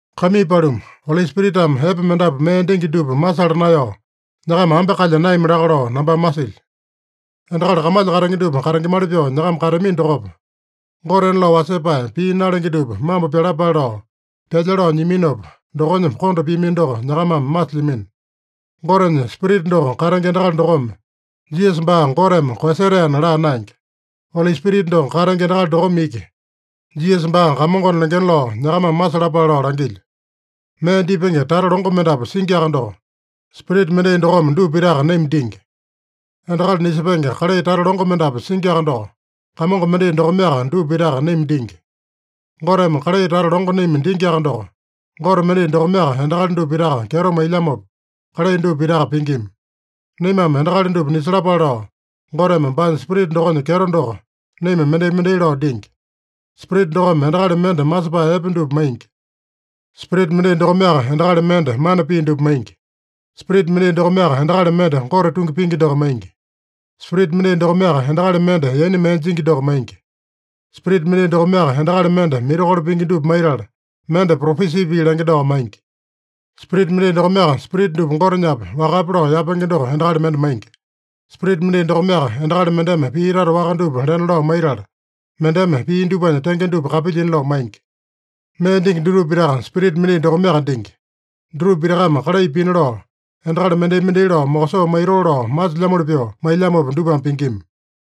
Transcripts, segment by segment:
Kaimii paluma, Oli Spiritame epe mendapu mee dingi dupa masala naeyao, nyakama ambe kalya naeyami laka lao nambame masilyo. Endakali kamalya katenge dupa katengemali pyoo nyakama kateamino dokopa, gotena lao wasepae, pii nalenge dupa mambo pyalapale lao pyalya lao nyiaminopa, dokonya konda piamino doko nyakamame masilyamino. Gotenya Spirita doko katenge endakali dokome, “Jisasa baa Goteme koeyasetaena” laa naenge. Oli Spirita doko katenge endakali dokome iki, “Jisasa baa Kamongona” lengena lao nyakamame masalapale lao langilyo. Mee dipenge tata longo mendapu singiaka doko, Spirita mendai dokome dupa pitaka naima dingi. Endakali nisepenge kalai tata longo mendapu singiaka doko, Kamongo mendai dokomeaka dupa pitaka naima dingi. Goteme kalai tata longo naima dingiaka doko, Gote mendai dokomeaka endakali dupa pitaka kyeto mailyamopa, kalai dupa pitaka pingima. Naimame endakali dupa nisalapale lao, Goteme baanya Spirita dokonya kyeto doko naima mendai-mendai lao dingi. Spirita dokome endakali mende masepae epe dupa maingi. Spirita mendai dokomeaka endakali mende mana pii dupa maingi. Spirita mendai dokomeaka endakali mende Gote tungi pingi doko maingi. Spirita mendai dokomeaka endakali mende yaina mee jingi doko maingi. Spirita mendai dokomeaka endakali mende mirakolo pingi dupa maitala, mende propesi pii lenge doko maingi. Spirita mendai dokomeaka spirita dupa Gotenyape, wakape lao yapenge doko endakali mende maingi. Spirita mendai dokomeaka endakali mendeme pii tata waka dupa lena lao maitala, mendeme pii dupanya tenge dupa kapilyina lao maingi. Mee dingi dutupa pitaka Spirita mendai dokomeaka dingi. Dutupa pitakame kalai pina lao, endakali mendai-mendai lao mokosoo maitoo lao masilyamoli pyoo mailyamopa dupame pingima.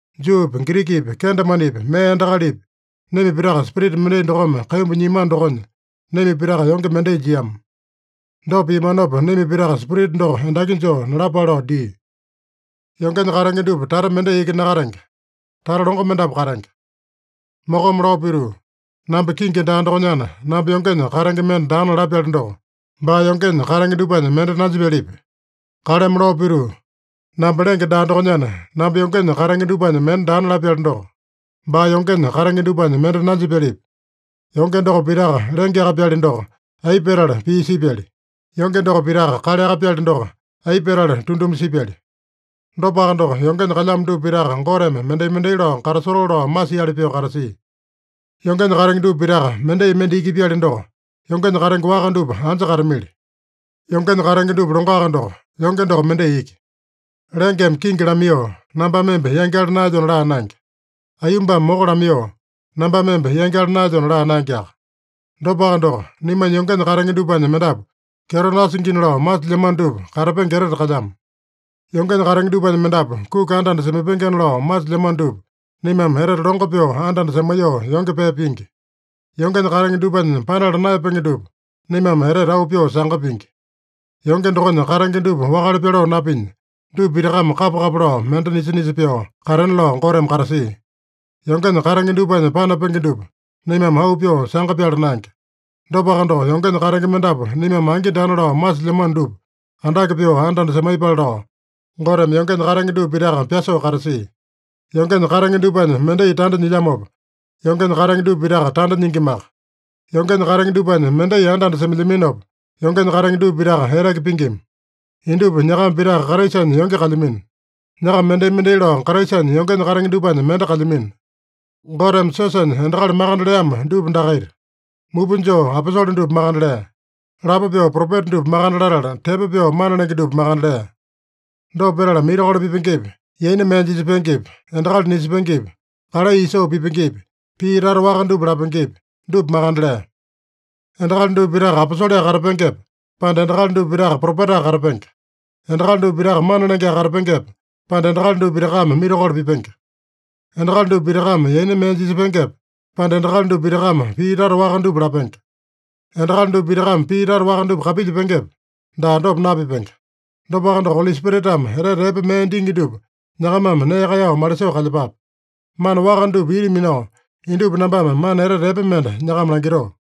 Juupi, Girikipi, kendemanepi, mee endakalipi, naima pitaka Spirita mendai dokome kaimbu nyiamano dokonya, naima pitaka yonge mendai jiama. Dopa piamanopa, naima pitaka Spirita doko endaki joo nalapale lao dia. Yongenya katenge dupa tata mendai iki nakatenge. Tata longo mendapu katenge. Mokome lao pituu, “Namba kingi daa dokonyana, namba yongenya katenge mende daana” lapyali doko, baa yongenya katenge dupanya mende nanjipyalipi? Kaleme lao pituu, “Namba lenge daa dokonyana, namba yongenya katenge dupanya mende daana” lapyali doko, baa yongenya katenge dupanya mende nanjipyalipi? Yonge doko pitaka lengeaka-pyali doko, aipa petala pii sipyali? Yonge doko pitaka kaleaka-pyali doko, aipa petala tunduma sipyali? Dopaka doko, yongenya kalyamo dupa pitaka Goteme mendai-mendai lao katasotoo lao masiali pyoo katasia. Yongenya katenge dupa pitaka mendai mende iki-pyali doko, yongenya katenge waka dupa anja katamili? Yongenya katenge dupa longoaka doko, yonge doko mendai iki. Lengeme kingi lamaiyoo, “Nambame emba yangyala naelyona” laa naenge. Aiyombame moko lamaiyoo, “Nambame emba yangyala naelyona” laa naengeaka. Dopaka doko, naimanya yongenya katenge dupanya mendapu kyeto nasingina lao masilyamano dupa, katapenge etete kalyamo. Yongenya katenge dupanya mendapu kuki anda-anda semaipengena lao masilyamano dupa, naimame etete longo pyoo anda-anda semaiyoo yonge pee pingi. Yongenya katenge dupanya panala naeyapenge dupa, naimame etete auu pyoo sanga pingi. Yonge dokonya katenge dupa wakale pyaloo napinya, dupa pitakame kapa-kapa lao mende nisa-nisa pyoo katena lao Goteme katasia. Yongenya katenge dupanya panapenge dupa, naimame auu pyoo sanga pyala naenge. Dopaka doko, yongenya katenge mendapu naimame angi daana lao masilyamano dupa andake pyoo anda-anda semaiyepale lao, Goteme yongenya katenge dupa pitaka pyasoo katasia. Yongenya katenge dupanya mendai tanda nyilyamopa, yongenya katenge dupa pitaka tanda nyingimaka. Yongenya katenge dupanya mendai anda-anda semailyaminopa, yongenya katenge dupa pitaka eteke pingima. Indupa nyakama pitaka Kraisanya yonge kalyamino. Nyakama mendai-mendai lao Kraisanya yongenya katenge dupanya mende kalyamino. Goteme siosanya endakali makande leamo dupa dakaita: Mupa joo aposole dupa makande lea. Lapo pyoo propeta dupa makande latala, tepo pyoo mana lenge dupa makande lea. Dopa petala mirakolo pipengepi, yaina mee jisepengepi, endakali nisepengepi, kalai isoo pipengepi, pii tata waka dupa lapengepi, dupa makande lea. Endakali dupa pitaka aposoleaka katapengepe, pande endakali dupa pitaka propetaka katapenge? Endakali dupa pitaka mana lengeaka katapengepe, pande endakali dupa pitakame mirakolo pipenge? Endakali dupa pitakame yaina mee jisepengepe, pande endakali dupa pitakame pii tata waka dupa lapenge? Endakali dupa pitakame pii tata waka dupa kapilyepengepe? Daa, dopa napipenge. Dopaka doko, Oli Spiritame etete epe mee dingi dupa nyakamame nee kaeyao malisoo kalyepape. Mana waka dupa ita minao, indupa nambame mana etete epe mende nyakama langitoo.